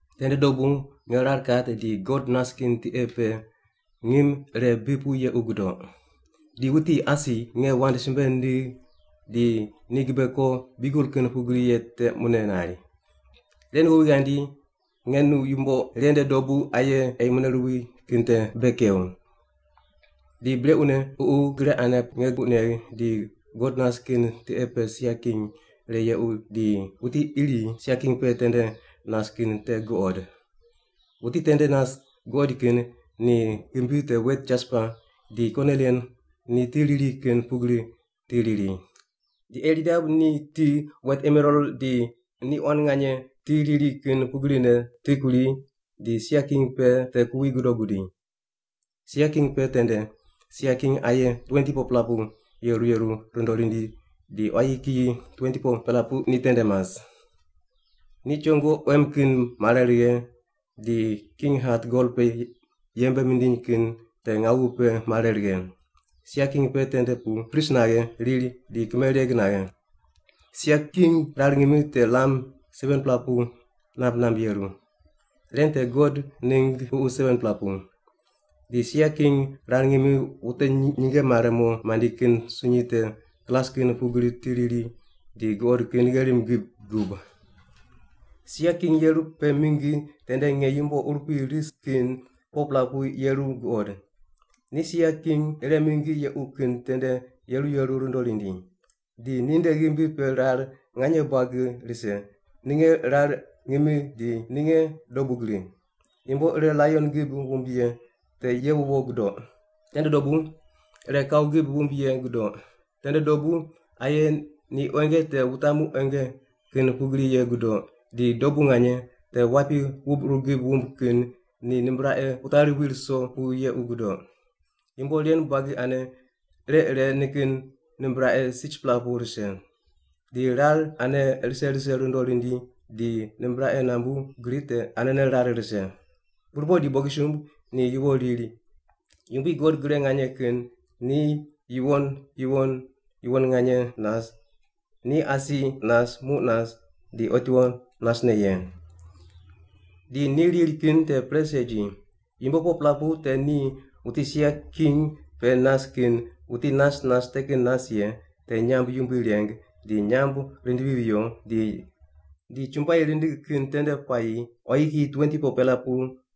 Tende dobu nge rar kat di God nas kin tiqe pe ngim ire bi pu yequ gudoq. Di wuti asi nge wand simbe nindigh di ni gibe ko biugel kin pugri ye te mune nari, “Ren ghowi ghandi nge nu yumbo ren nde dobu aye ei mune ruwi kin te bei kew.” Di brequne Ququ gre ane nge puq negh di God nas kin tiqe pe sia king ire yequ di wuti iri sia king pe tende nas kin te guqod. Wuti tende nas guqoid kin ni ghimbi te wet jaspa di konilian ni ti riri kin pugri ti riri. Di eirdab ni ti wet emeral ni quan nganye ti riri kin pugrine ti kuri di sia king pe te kuwi godo gudi. Sia king pe tende sia king aye 24-pela pu yeru yeru rundo rindi di quayi kiyi 24-pela pu ni tende mas. Ni chongo quem kin mare righe di king hat gol pe yembe mindiny kin te ngawu pe mare righe. Sia king pe tende pu pris naghe, riri di kimereg naghe. Sia king rar ngimi te lam 7-pela pu namb namb yeru. Ren te God ningg ququ 7-pela pu. Di sia king rar ngimi wute nyinge mare mo mandi kin sunyi te glas kin pugri ti riri di guqod kin gherim gib gub. Sia king yeru pe mingi tende nge yumbo urupui ris kin 4-pela pu yeru guqod. Ni sia king ire mingi yequ kin tende yeru yeru rundo rindi. Di ninde ghimbi pe rar nganye buagi rise, ninge rar ngimi di ninge dobu gri. Yumbo ire laion gib wumb ye te ye wuwo gudoq. Tende dobu ire kau gib wumb ye gudoq, tende dobu aye ni quenge te wutamu quenge kin pugri ye gudoq, di dobu nganye te wapi wubquru gib wumb kin ni nimbraqe wutari wi ruso pu yequ gudoq. Yumbo ren buagi ane ire ire nikin nimbraqe 6-pela pu rise. Di rar ane rise rise rundo rindi di nimbraqe nambu gri te anene rar rise. Burpoq di bogisumb ni yuwo riri, “Yumbui God Gre Nganye Kin, ni yuwon, yuwon, yuwon nganye nas. Ni asi nas, muq nas, di otiwo nasne ye.” Di ni riri kin te pre segi. Yumbo 4-pela pu te ni wuti sia king pe nas kin, wuti nas nas te kin nas ye, te nyamb yumbui reng, ni nyamb rindivi viyo, di chumbuai rindig kin tende puayi quayi kiyi 24-pela pu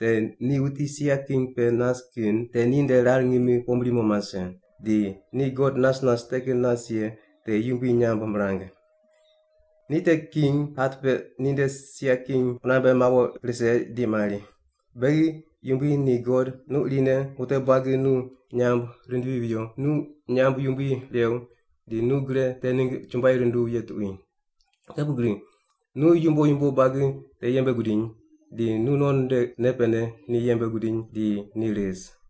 te ni wuti sia king pe nas kin te ninde rar ngimi pombri mo mase di ni God nas nas te kin nas ye te yumbui nyamb mirang. Ni te king hat te ninde sia king qunambe mawo rise di mari, “Beghi Yumbui di God, nu irine wute buagi nu nyamb rindivi viyo, nu nyamb yumbui rew, di nu gre te ningg chumbuai runduw ye tuqui. Te pugri nu yumbo yumbo buagi te yembe gudiny, di nu non nde nei pene ni yembe gudiny di ni ris.”